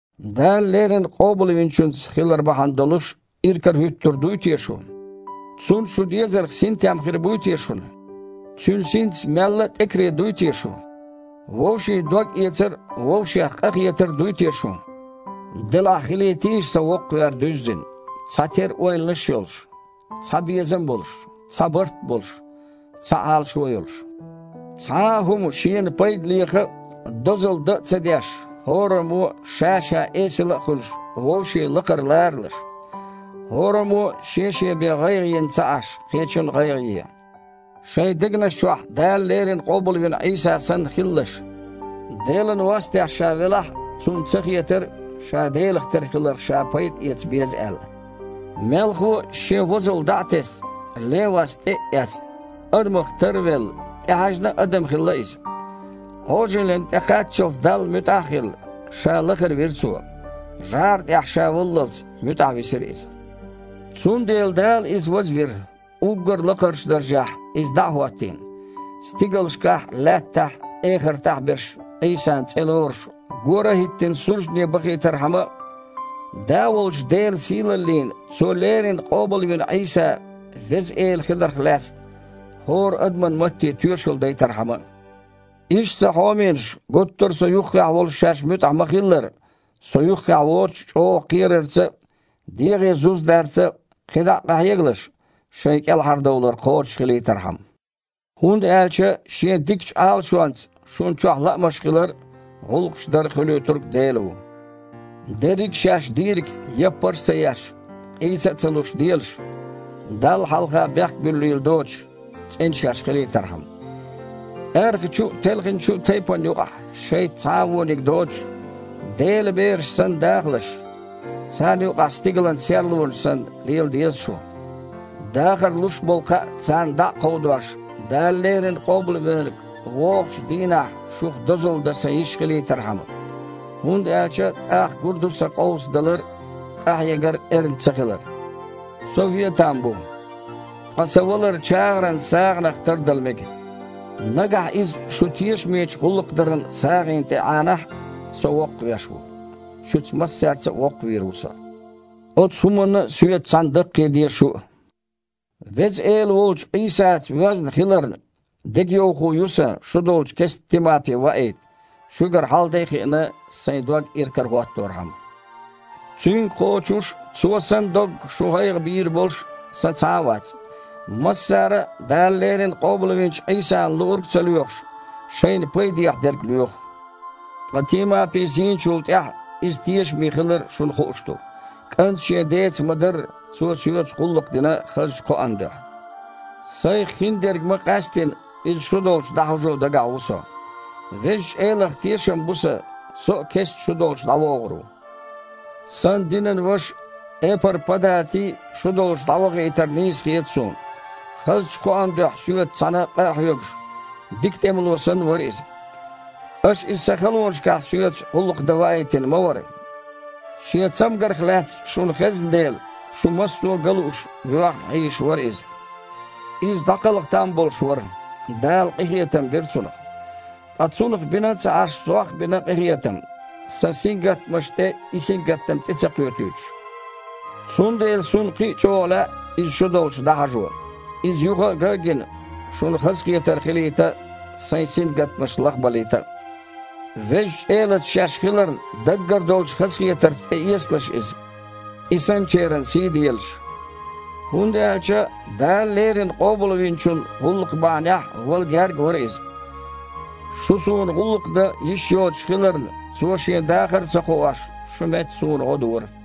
Дала леррина Къобалвинчуьнца хилар бахьана долуш иракарахІуьттур дуй те шу? Цунна шу дезарх синтем хир буй те шуна? Цуьнан Синца мелла а тІекаре дуй те шу? Вовшийн догъэцар а, вовшех къахетар а дуй те шун? Делахь хилийтийша сан воккхавер дуьззина, цхьатерра ойланаш а йолуш, цхьа безам а болуш, цхьа барт а болуш, цхьа Іалашо а йолуш. Цхьа а хІума шена пайда леха а, дозалла дан а ца деш, хІораммо а, ша-ша эсала а хуьлуш, вовшийн лакхара ларалаш. ХІораммо а, шен-шен бен гІайгІа йина ца Іаш, кхечун а гІайгІа е. Шайн дегнаш чохь Дала леррина къобалвина Іийса санна хилалаш. Делан вастехь Ша велахь а, Цунна ца хетара, Ша Делах тера хиларх Ша пайда эца беза аьлла. Мелхо а, Шен возалла дІа а тесна, лен васт тІе а эцна, адамах тар а велла, тІехьаьжна а адам хилла Иза. Іожаллина тІекхаччалц Далла муьтІахь а хилла, Ша лахара вира Цо. ЖІара тІехь Ша валлалц, муьтІахь висира Иза. Цундела Дала Иза вазвира, уггар а лакхарчу даржехь Иза дІа а хІоттийна, стигалшкахь а, лаьттахь а, эхартахь а берш Іийсан цІе лоруш, гора а хІиттина, суждане бахийтархьама а, Да волчу Делан сийлаллина Цо леррина къобалвина Іийса Веза Эла хиларх лаьцна хІора адаман матте тоьшалла дайтархьама а. Иштта, сан хьоменаш, гуттара а со юххехь волуш шаьш муьтІахь ма-хиллара, со юххехь воцуш а чІогІачу кхерарца а, дегІе зуз дарца а кхидІа къахьегалаш, шайн кІелхьардовлар кхочушхилийтархьама. ХІунда аьлча Шен дикачу Іалашонца шуна чохь лаамаш хилар а, гІуллакхаш дар а Хуьлуьйтург Дела ву. Дерриг а шаьш дийриг, яппарш а ца еш, къийса а ца луш, делаш, Далла хьалха бехк буьллийла доцуш, цІена шаьш хилийтархьама. Аьрхачу а, телхинчу а тайпанна юкъахь шайца цхьа а вониг доцуш, Делан бераш санна дахалаш. Царна юкъахь стигалан серлонаш санна лела деза шу, дахар луш болу кхаъ царна дІа а кховдош, Дала леррина Къобалвинарг вогІучу дийнахь шух дозалла дан сан йиш хилийтархьама, хІунда аьлча тІаккха гур ду сан къовсадалар а, къахьегар а эрна ца хилар. Со вен там бу. Ткъа сан валар чагІаран сагІанах тардала мега. Нагахь иза шун тешамечу гІуллакхдаран сагІина тІе Іанахь а, со воккхавеш ву – шуьца массаьрца а воккхавийр ву со. Оцу хІуманна а соьца цхьаьна даккхийде шу а. Веза Эла волчу Іийсаца воьзна хиларна, дегайовхо ю сан шу долчу кестта Тимапи ваийта, шуьгара хьал-де а хиъна, сайн дог иракарахІотторхьама. Цуьнга кхочуш а, цо санна доггах шун гІайгІа бийр болуш а сан цхьа а вац. Массара а, Дала леррина къобалвинчу Іийсана луург а ца лоьхуш, шайна пайдехьа дерг лоьху. Ткъа Тимапи, зийначул тІаьхьа, иза тешаме хилар шуна хууш ду. КІанта шен деца ма-дарра, цо соьца гІуллакх дина хазачу кхоан дуьхьа. Сайх хиндерг ма-къаьсттина, иза шу долчу дІахьажо дагахь ву со. Везачу Элах тешам бу сан: со а кестта шу долчу дІавогІур ву. Сан динан ваша Эпар-Падати шу долчу дІавахийтар нийса хета суна. Хазачу кхоан дуьхьа соьца цхьаьна къа а хьоьгуш, дика тІемало санна вара иза. Аша иза сан халонашкахь соьца гІуллакх дан ваийтина ма вара. Шен цамгарх лаьцна шуна хезна дела, шу массо а ган лууш, воьхна хьийзаш вара иза. Иза дІакхалха там болуш вара. Дала къинхетам бира цунах. Ткъа цунах бина а ца Іаш, сох а бина къинхетам, сан сингаттамашна тІе и сингаттам тІе ца кхоьтуьйтуш. Цундела суна кхин а чІогІа лаьа иза шу долчу дІахьажо: иза юха а ган а гина, шуна хазахетар хилийта а, сайн сингаттамаш лахбалийта а. Везачу Элаца шаьш хиларна даггара долчу хазахетарца тІеэцалаш иза, и санначеран сий а делаш. ХІунда аьлча Дала леррина Къобалвинчун гІуллакх бахьанехь вала гергга вара иза. Шу суна гІуллакх дан йиш йоцуш хиларна, цо, шен дахар а ца кхоош, шун метта, суна гІо дора.